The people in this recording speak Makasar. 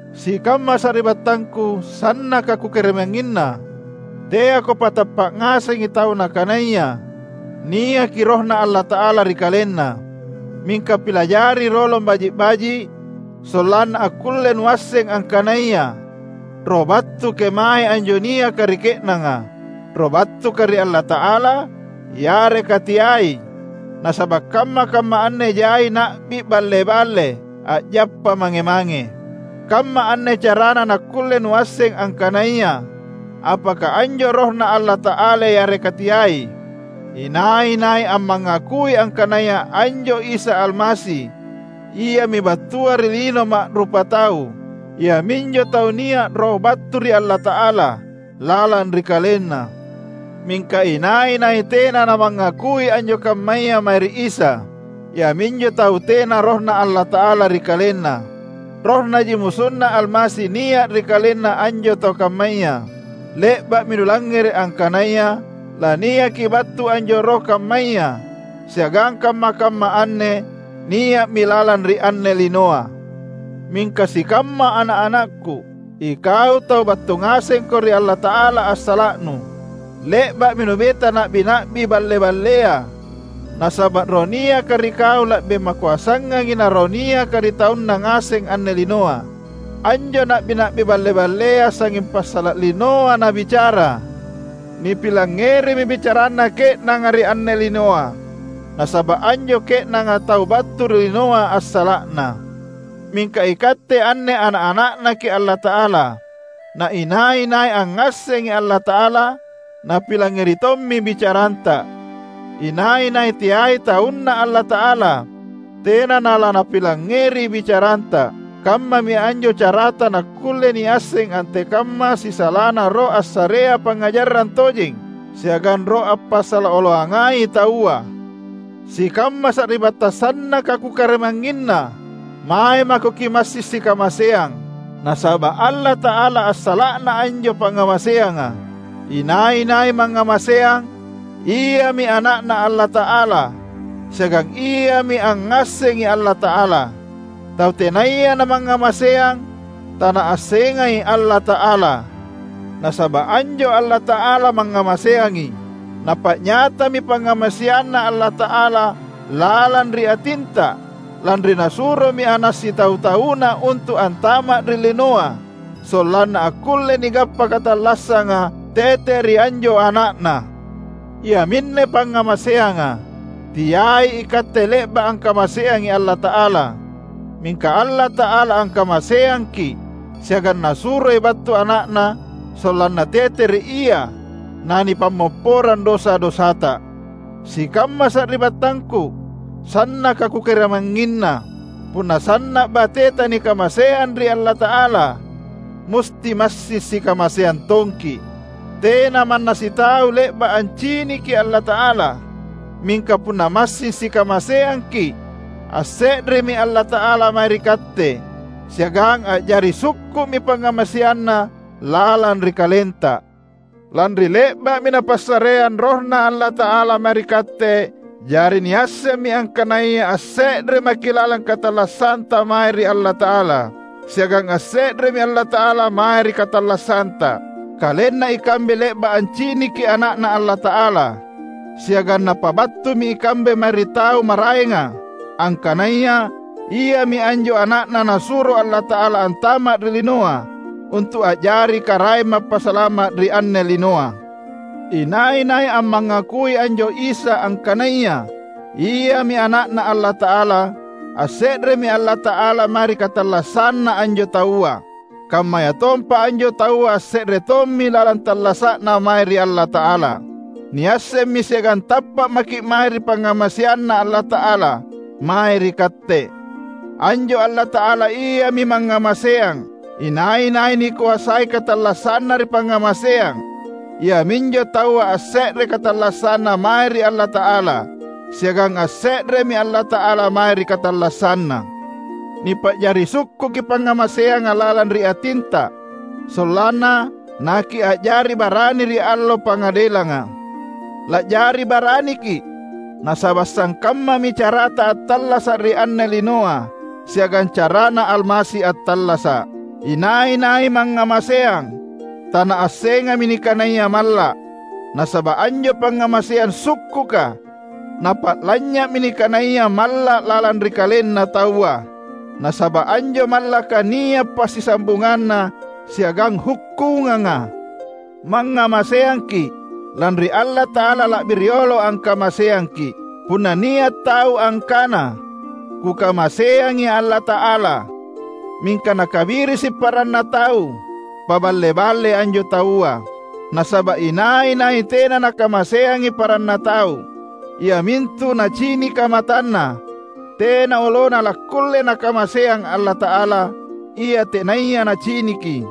Sikamma sari’battangku sannaka kukarimangnginna! Teako patappa’ ngasengi tau nakanaya niaki RohNa Allata’ala ri kalenna; mingka pilajari rolong baji’-baji’ sollanna akkulle nuasseng angkanaya roh battu kemae anjo niaka ri ke’nanga: Roh battuka ri Allata’ala yareka teai. Nasaba’ kamma-kamma anne jai na’bi balle-balle a’jappa mange-mange. Kamma anne carana nakkulle nuasseng angkanaya apaka anjo RohNa Allata’ala yareka teai: Inai-nai ammangakui angkanaya anjo Isa Almasi Iami battua ri lino ma’rupatau, iaminjo taua nia’ Roh battu ri Allata’ala lalang ri kalenna. Mingka inai-nai tena namangakui anjo kammaya mae ri Isa, iaminjo taua tena RohNa Allata’ala ri kalenna. Rohnaji MusunNa Almasi nia’ ri kalenna anjo tau kammaya. Le’ba’mi nulangngere’ angkanaya laniaki battu anjo roh kammaya, siagang kamma-kamma anne nia’mi lalang ri anne linoa. Mingka sikamma ana’-anakku, ikau tau battu ngasengko ri Allata’ala assala’nu. Le’ba’mi nubeta na’bi-na’bi balle-ballea, nasaba’ Roh niaka ri kau la’bi makoasangangi na roh niaka ri taunna ngaseng anne linoa. Anjo na’bi-na’bi balle-ballea sangnging passala’ linoa nabicara; nipilangngerimi bicaranna ke’nanga ri anne linoa, nasaba’ anjo ke’nanga tau battu ri linoa assala’na. Mingka ikatte anne ana’-ana’Naki’ Allata’ala; na inai-nai angngassengi Allata’ala, napilangngeri tommi bicaranta. Inai-nai teai taunNa Allata’ala tena nalaNapilangngeri bicaranta. Kammami anjo carata nakkulle niasseng antekamma sisalana Roh assarea pangngajarang tojeng, siagang roh ampasala oloangai taua. Sikamma sari’battang sannaka kukarimangnginna! Mae mako kimassing sikamaseang; nasaba’ Allata’ala assala’na anjo pangngamaseanga. Inai-nai mangngamaseang, iami ana’Na Allata’ala siagang iami angngassengi Allata’ala. Tau tenaya namangngamaseang, tanaassengai Allata’ala; nasaba’ anjo Allata’ala mangngamaseangi. Napa’nyatami pangngamaseanNa Allata’ala lalang ri atinta, lanri Nasuromi Ana’ sitau-tauNa untu’ antama’ ri linoa sollanna akkulle nigappa katallassanga tete ri anjo Ana’Na. Iaminne pangngamaseanga: Teai ikatte le’ba’ angkamaseangi Allata’ala, mingka Allata’ala angkamaseangki’ siagang Nasuroi battu Ana’Na sollanna tete ri Ia nanipammopporang dosa-dosata. Sikamma sari’battangku, sannaka kukarimangnginna; punna sanna’ bateta nikamaseang ri Allata’ala, musti massing sikamaseang tongki’. Tena manna sitau le’ba’ anciniki Allata’ala; mingka punna massing sikamaseangki’, asse’remi Allata’ala mae ri katte siagang a’jari sukku’mi pangngamaseanNa lalang ri kalenta. Lanri le’ba’mi Napassareang RohNa Allata’ala mae ri katte, jari niassemmi angkanaya asse’re maki’ lalang katallassanta mae ri Allata’ala, siagang asse’remi Allata’ala mae ri katallassanta. Kalenna ikambe le’ba’ anciniki Ana’Na Allata’ala, siagang napabattumi ikambe mae ri tau maraenga angkanaya Iami anjo Ana’Na Nasuro Allata’ala antama’ ri linoa untu’ a’jari Karaeng Mappasalama’ ri anne linoa. Inai-nai ammangakui anjo Isa angkanaya Iami Ana’Na Allata’ala, asse’remi Allata’ala mae ri katallassanna anjo taua; kammayatompa anjo taua asse’re tommi lalang tallasa’na mae ri Allata’ala. Niassemmi siagang tappa’ maki’ mae ri pangngamaseanNa Allata’ala mae ri katte. Anjo Allata’ala Iami mangngamaseang. Inai-nai nikoasai katallassanna ri pangngamaseang, iaminjo taua asse’re katallassanna mae ri Allata’ala, siagang asse’remi Allata’ala mae ri katallassanna. Nipa’jari sukkuki pangngamaseanga lalang ri atinta, sollanna nakia’jari barani ri Allo Pangadelanga. La’jari baraniki’, nasaba’ sangkammami carata attallasa’ ri anne linoa siagang caraNa Almasi attallasa’. Inai-nai mangngamaseang, tanaassengami nikanaya malla’; nasaba’ anjo pangngamaseang sukkuka napa’lanynya’mi nikanaya malla’ lalang ri kalenna taua; nasaba’ anjo mallaka nia’ passisambunganna siagang hukkunganga. Mangngamaseangki’, lanri Allata’ala la’bi riolo angkamaseangki’. Punna nia’ tau angkana, "Kukamaseangi Allata’ala," mingka nakabirisi paranna tau, paballe-ballei anjo taua. Nasaba’ inai-nai tena nakamaseangi paranna tau, iamintu nacinika matanna, tena olona lakkulle nakamaseang Allata’ala, ia tenaya naciniki.